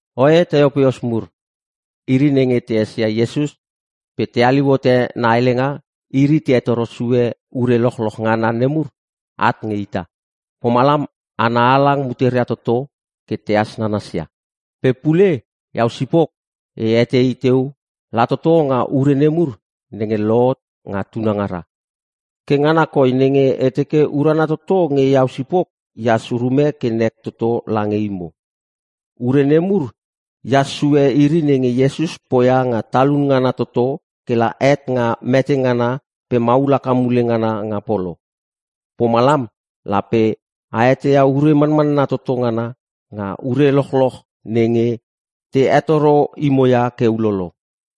Oe Teopilos mur; Iri nenge te esia Iesus pe te haliu hote na helenga iri te hetoro sue ure lochloch ngana nemur at nge ita. Pomalam hana halang muteria toto ke tehas nanasia. Pe pule iau sipok e etei teu la toto nga ure nemur nenge lohot nga tunangara. Ke ngana koi nenge e teke urana toto nge iau sipok ehas urume ke nek toto lange imo. (Ure nemur ehas sue iri nenge Iesus poia nga talun ngana toto ke la het nga mete ngana pe maul haka mule ngana nga polo.) Pomalam lape a eteia ure manmanna toto ngana nga ure lochloch nenge te hetoro imo ia ke ulolo.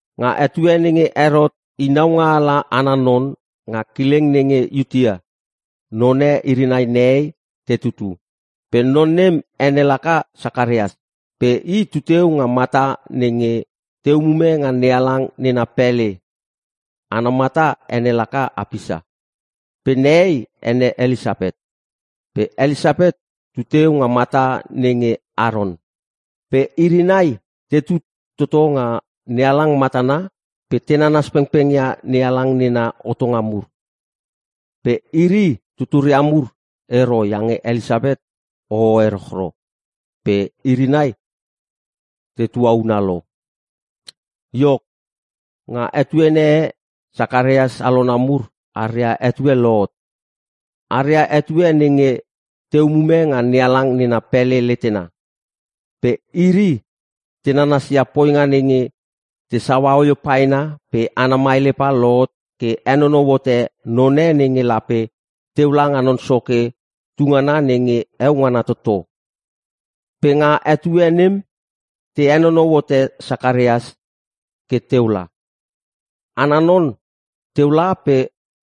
Nga etue nenge Herot i naungaala ana non nga kileng nenge Iutea, none iri nai nehei te tutu. Pe non nem ene laka Sakarias. Pe i tu teu nga mata nenge te umume nga NeHalang nena pele. Ana mata ene laka Apisa. Pe nehei ene Elisapet. Pe Elisapet tuteu nga mata nenge Aron. Pe iri nai tetu toto nga NeHalang matana pe te nanas pengpeng ia NeHalang nena hotonga mur. Pe iri tuturia mur ero iange Elisapet hoho erochro pe iri nai te tuauna lo. Iok, nga etuene e Sakarias alona mur aria etue lohot. Aria etue nenge te umume nga NeHalang nena pele letena. Pe iri te nanasia poinga nenge te saua oio paena pe ana maelepa lohot ke henonou hote none nenge lape teu langa Non Soke tu ngana nenge heo ngana toto. Pe nga etue nem te henonou hote Sakarias ke teu la. Ana non teu la pe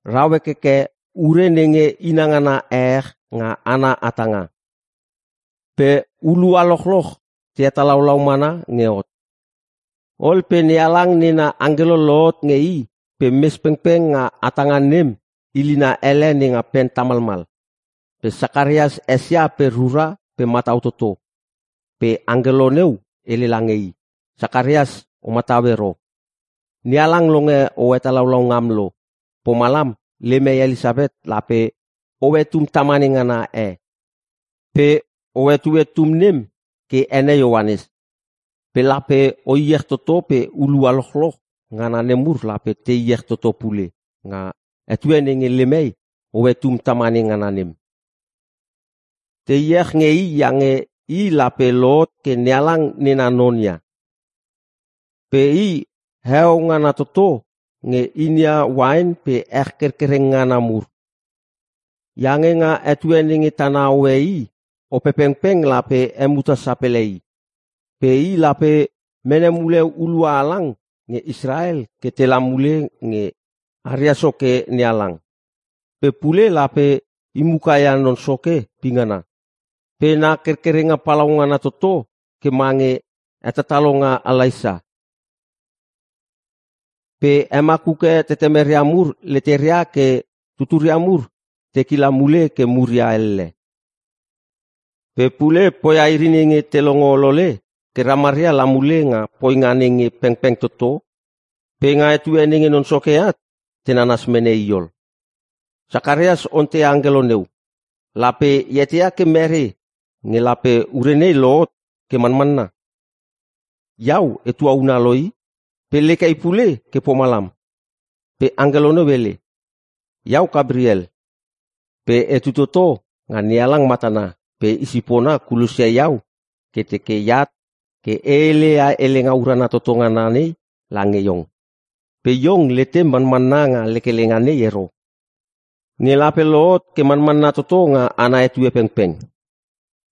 rau hekheke ure nenge inangana ehech nga ana hatanga. Pe hulua lochloch te hetalaulau mana nge hot. Ol pe NeHalang nena angkelo lohot nge i pe mes pengpeng nga hatanga nem ilina ele nenga pen tamalmal. Pe Sakarias esia pe rura pe matau toto. Pe angkelo neu hele lange i, “Sakarias o matau ero! NeHalang longe o hetalaulau ngam lo. Pomalam lem hei Elisapet lape hoe tum tamane ngana e. Pe o hetue tum nem ke ene Ioanes. Pe lape o iech toto pe hulua lochloch ngana nemur lape te iech toto pule nga etue nenge lem hei hoe tum tamane ngana nem. Te iech nge i iange i lape lohot ke NeHalang nena non ia. Pe i heo ngana toto nge inia uain pe ech kerkereng ngana mur. Iange nga etue nenge tana hoe i, Opepengpeng lape hemuta sapele i. Pe i lape mene mule hulua halang nge Israel ke tela mule nge aria Soke NeHalang. Pe pule lape i muka ia Non Soke pingana. Pe na kerkerenga palaungana toto ke mange hetatalonga Elaisa. Pe hemakuke tetemeria mur leteria ke tuturia mur te kila mule ke muria elle. Pe pule poia iri nenge te longo olole ke ramaria la mule nga poinga nenge pengpeng toto pe nga etue nenge Non Soke at te nanas mene i ol.” Sakarias onteia angkelo neu. “Lape e eteia ke mere nge lape ure nei lohot ke manmanna? Iau e tuauna lo i! Pe lek hei pule ke pomalam.” Pe angkelo neu hele, “Iau Kapriel. Pe etu toto nga NeHalang matana pe i sipona kulosia iau ke teke e at ke e hele ia helenga urana toto ngana nei lange iong. Pe iong letem manmanna nga helenga nei ero nge lape lohot ke manmanna toto nga ana etue pengpeng.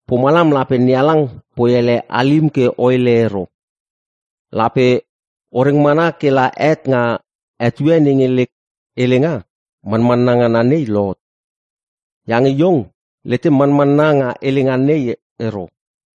Pomalam lape NeHalang poi ele halim ke o hele ero. Lape o reng mana ke la het nga etue nenge lek helenga manmanna ngana nei lohot. Iange iong letem manmanna nga helenga nei ero.”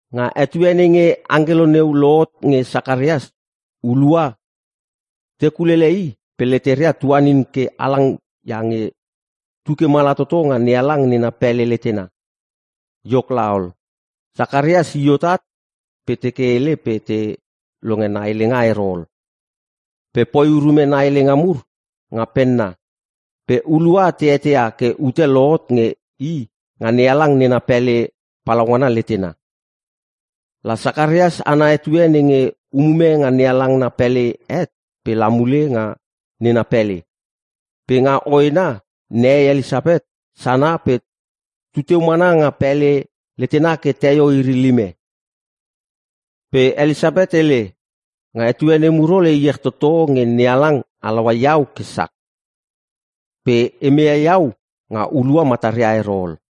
Nga etue nenge angkelo neu lohot nge Sakaraia hulua te kulele i pe leteria tuanin ke halang iange tu ke mala toto nga NeHalang nena pele letena. Iok laol, Sakarias i hot at pe teke hele pe te longe na helenga ero ol. Pe poi urume na helenga mur nga penna. Pe hulua te eteia ke ute lohot nge i nga NeHalang nena pele palaungana letena. La Sakarias ana etue nenge umume nga NeHalang na pele het pe la mule nga nena pele. Pe nga hoena nehei Elisapet sana pe tuteu mana nga pele letena ke teio iri lime. Pe Elisapet hele, “Nga etue nemur ol e iech toto nge NeHalang halaua iau ke sak! Pe e meia iau nga hulua mataria ero ol!”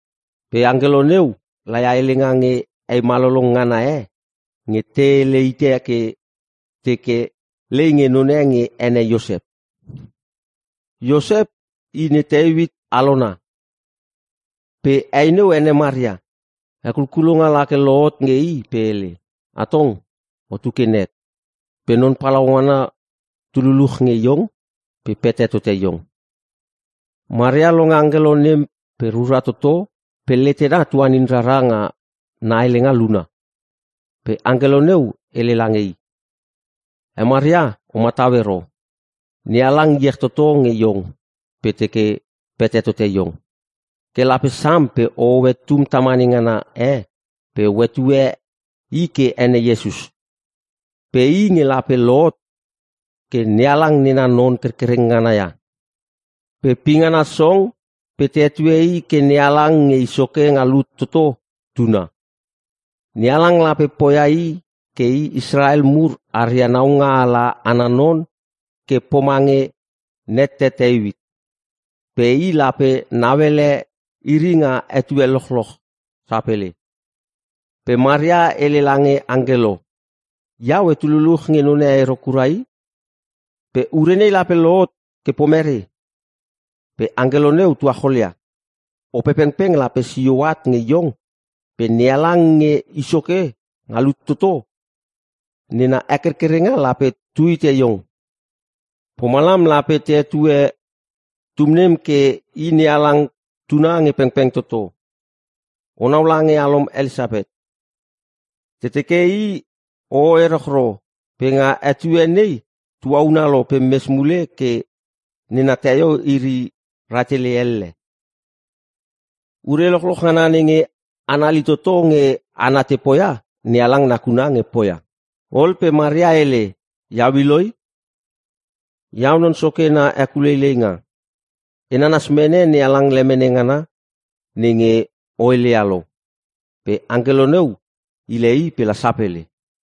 Pe angkelo neu laia helenga nge hei malolong ngana e nge te hele hite ke te teke lei nge none nge ene Iosep. Iosep i ne Teuit alona. Pe he neu ene Maria. Hekulkulonga lake lohot nge i pe hele, “Atong otu ke nek pe Non Palaungana tu luluch nge iong pe pete tote iong.” Maria longe angkelo nem pe rura toto pe letena tuanin rara nga na helenga luna. Pe angkelo neu hele lange i, “He Maria o matau ero. NeHalang iech toto nge iong pe teke pete tote iong. Ke lape sam pe ohoe tum tamane ngana e pe o hetue i ke ene Iesus. Pe i nge lape lohot ke NeHalang nena non kerkereng ngana ia. Pe pingana song pe te hetue i ke NeHalang Nge I Soke Nga Lut Toto Tuna. NeHalang lape poia i ke i Israel mur aria naungaala ana non ke pomange nette Teuit. Pe i lape nauele iri nga etue lochloch sapele.” Pe Maria hele lange angkelo, “Iau etu luluch nge none ero kura i. Pe ure nei lape lohot ke pomere?” Pe angkelo neu tuacholia, “Opepengpeng lape sio at nge iong pe NeHalang Nge I Soke Nga Lut Toto nena hekerkerenga lape tu hite iong. Pomalam lape te hetue tum nem ke i NeHalang Tuna nge pengpeng toto. Onau lange alom Elisapet. Te teke i hoho erochro pe nga etue nei tuauna lo pe mes mule ke nena teio iri rahtele elle. Ure lochloch ngana nenge anali toto nge hana te poia NeHalang nakuna nge poia.” Ol pe Maria hele, “Iau i loi. Iau Non Soke na hekuleileinga. E nanas mene NeHalang lemene ngana nenge o heleia lo.” Pe angkelo neu hile i pe la sapele.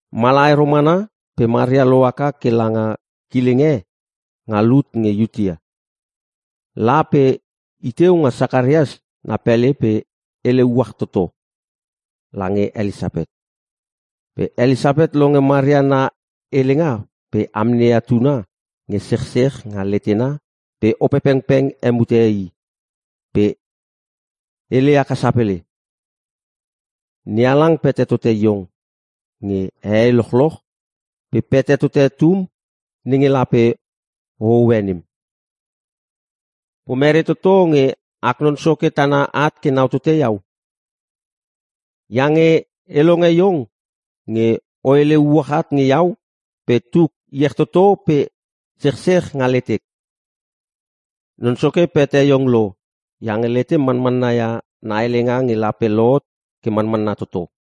Mala ero mana pe Maria lohaka ke langa kileng e nga lut nge Iutea. La pe i teu nga Sakarias na pele pe hele “Uach toto.” lange Elisapet. Pe Elisapet longe Maria na helenga pe amneia tuna nge sechsech nga letena pe Opengpeng hemute i pe hele haka sapele, “NeHalang pete tote iong nge hehei lochloch pe pete tote tum nenge lape o hoe nem. Pomere toto nge ak Non Soke tana at ke nau tote iau? Iange e longe iong nge o hele uach at nge iau pe tuk iech toto pe sechsech nga letek. Non Soke pete iong lo iange letem manmanna ia na helenga nge lape lohot ke manmanna toto.”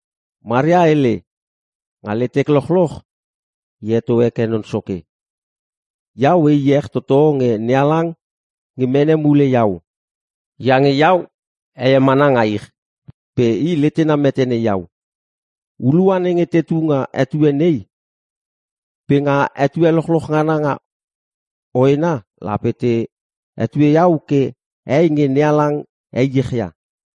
Maria hele, “Nga letek lochloch e heto heke Non Soke. Iau e iech toto nge NeHalang nge mene mule iau! Iange iau heie mana nga ich pe i letena metene iau. Hulua nenge tetu nga etue nei pe nga etue lochloch nga hoena lape te hetue iau ke hei nge NeHalang heiech ia.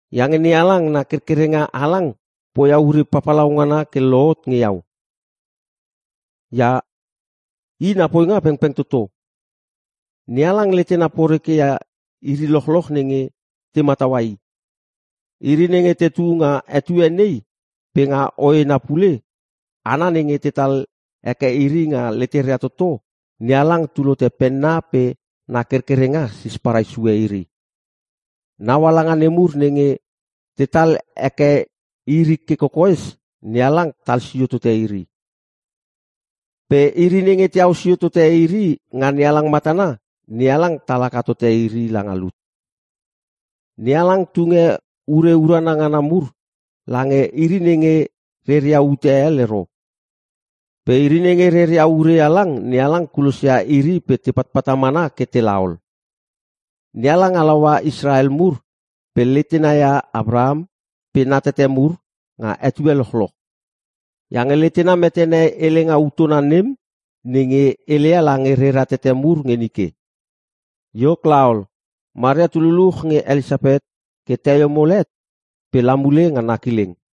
Iange NeHalang na kerkerenga halang poia ure papalau ngana ke lohot nge iau. Ia I na poinga pengpeng toto. NeHalang letena poreke ia iri lochloch nenge te mataua I. Iri nenge te tu nga etue nei pe nga hoena pule Hana nenge tetal heke iri nga leteria toto NeHalang tul hote penna pe na kerkerenga sisparai sue iri. Naungaala nemur nenge tetal heke iri ke kokoes NeHalang tal sio tote iri. Pe iri nenge teau sio tote iri nga NeHalang matana, NeHalang tal haka tote iri langa lut. NeHalang tunge ure urana ngana mur lange iri nenge reria ute hel ero. Pe iri nenge reria ure halang NeHalang kulosia iri pe te patpata mana ke tela ol. NeHalang halaua Israel mur pe letena ia Apraham pe na tete mur nga etue lochloch. Iange letena metene helenga utona nem nenge heleia lange rera tete mur nge nike.” Iok laol, Maria tu luluch nge Elisapet ke teio mol het pe la mule nga na kileng.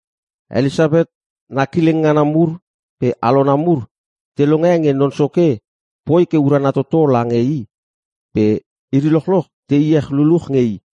Elisapet na kileng ngana mur pe alona mur te longe nge Non Soke poi ke urana toto lange i pe iri lochloch te iech luluch nge i.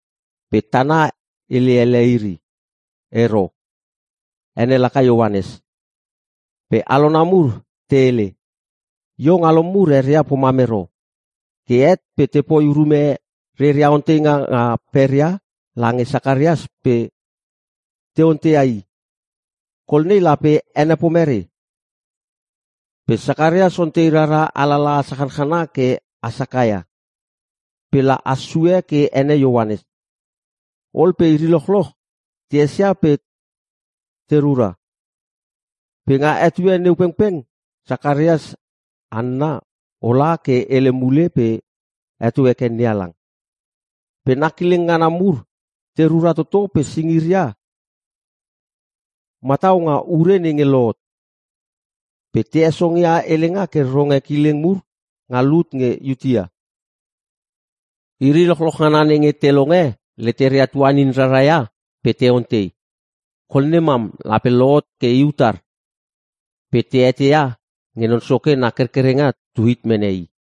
Pe tana hele ele iri, “Ero! Ene laka Ioanes.” Pe alona mur te hele, “Iong alom mur eria pomam ero!” Ke het pe tepoi urume reria onteinga nga peria lange Sakarias pe te onteia i, “Kol nei lape ene pomere?” Pe Sakarias ontei rara alalaha sachana ke has haka ia. Pe la has sue ke ene Ioanes. Ol pe iri lochloch te esia pe te rura. Pe nga etue neu pengpeng Sakarias hanna olha ke hele mule pe heto heke NeHalang. Pe na kileng ngana mur te rura toto pe singiria matau nga urene nge lohot. Pe te hesongia helenga ke ronge kileng mur nga lut nge Iutea. Iri lochloch ngana nenge te longe leteria tuanin raraia pe te ontei, “Kol nem mam lape lohot ke i utar?” Pe te eteia nge Non Soke na kerkerenga tu hit mene i.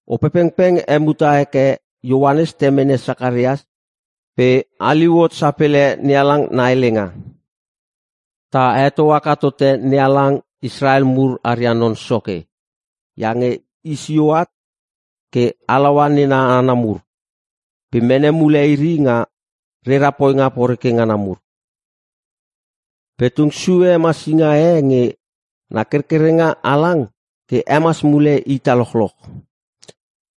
Opepengpeng hemuta heke Ioanes temene Sakarias pe haliu hot sapele NeHalang na helenga: “Ta heto haka tote NeHalang Israel mur aria Non Soke! Iange i sio at ke halaua nena hana mur pe mene mule iri nga reria poinga poreke ngana mur. Pe tung sue hemasinga e nge na kerkerenga halang ke hemas mule ita lochloch.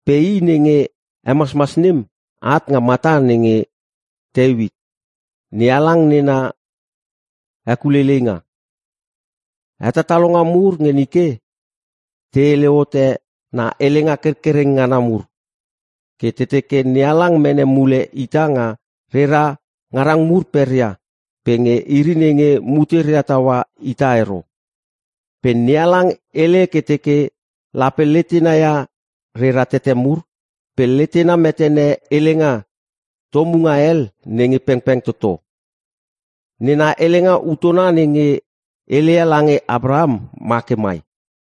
Pe i nenge hemasmas nem at nga mata nenge Teuit (NeHalang nena hekuleileinga). Hetatalonga mur nge nike te hele hote na helenga kerkereng ngana mur. Ke te teke NeHalang mene mule ita nga rera ngarang mur peria pe nge iri nenge muteria taua ita ero. Pe NeHalang hele ke teke lape letena ia rera tete mur pe letena metene helenga tomunga hel nenge pengpeng toto. Nena helenga utona nenge heleia lange Apraham ma ke mai: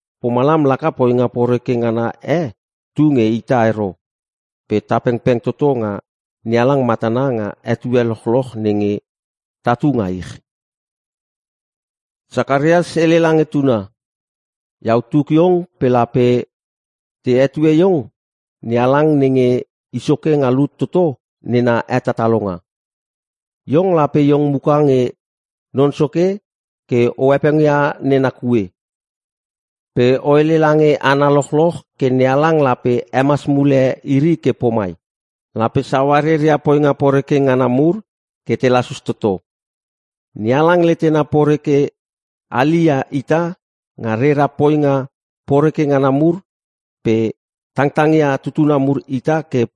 Pomalam laka poinga poreke ngana e tu nge ita ero pe ta pengpeng toto nga NeHalang matana nga etue lochloch nenge tatu nga ich.” Sakarias hele lange tuna, “Iau tuk iong pe lape te hetue iong NeHalang nenge I Soke nga Lut Toto nena hetatalonga. Iong lape iong muka nge Non Soke ke o hepengia nena kue. Pe o hele lange hana lochloch ke NeHalang lape hemas mule iri ke pomai: lape saua reria poinga poreke ngana mur ke te lasus toto. NeHalang letena poreke hali ia ita nga rera poinga poreke ngana mur pe tangtang ia tutuna mur ita ke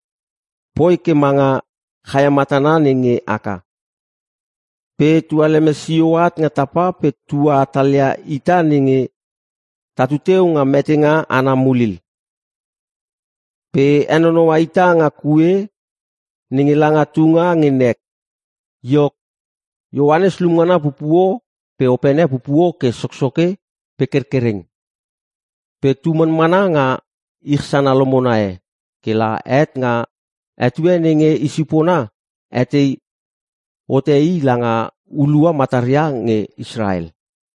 poi ke manga chaia matana nenge haka pe tualeme sio at nga tapa pe tua hatalia ita nenge ta tuteu nga metenga ana mulil. Pe henonoua ita nga kue nenge langa tunga nge nek.” Iok, Ioanes lumngana pupuo pe opene pupuo ke soksoke pe kerkereng. Pe tu manmana nga ich sana lomona e ke la het nga etue nenge i sipona hetei hote i langa hulua mataria nge Israel.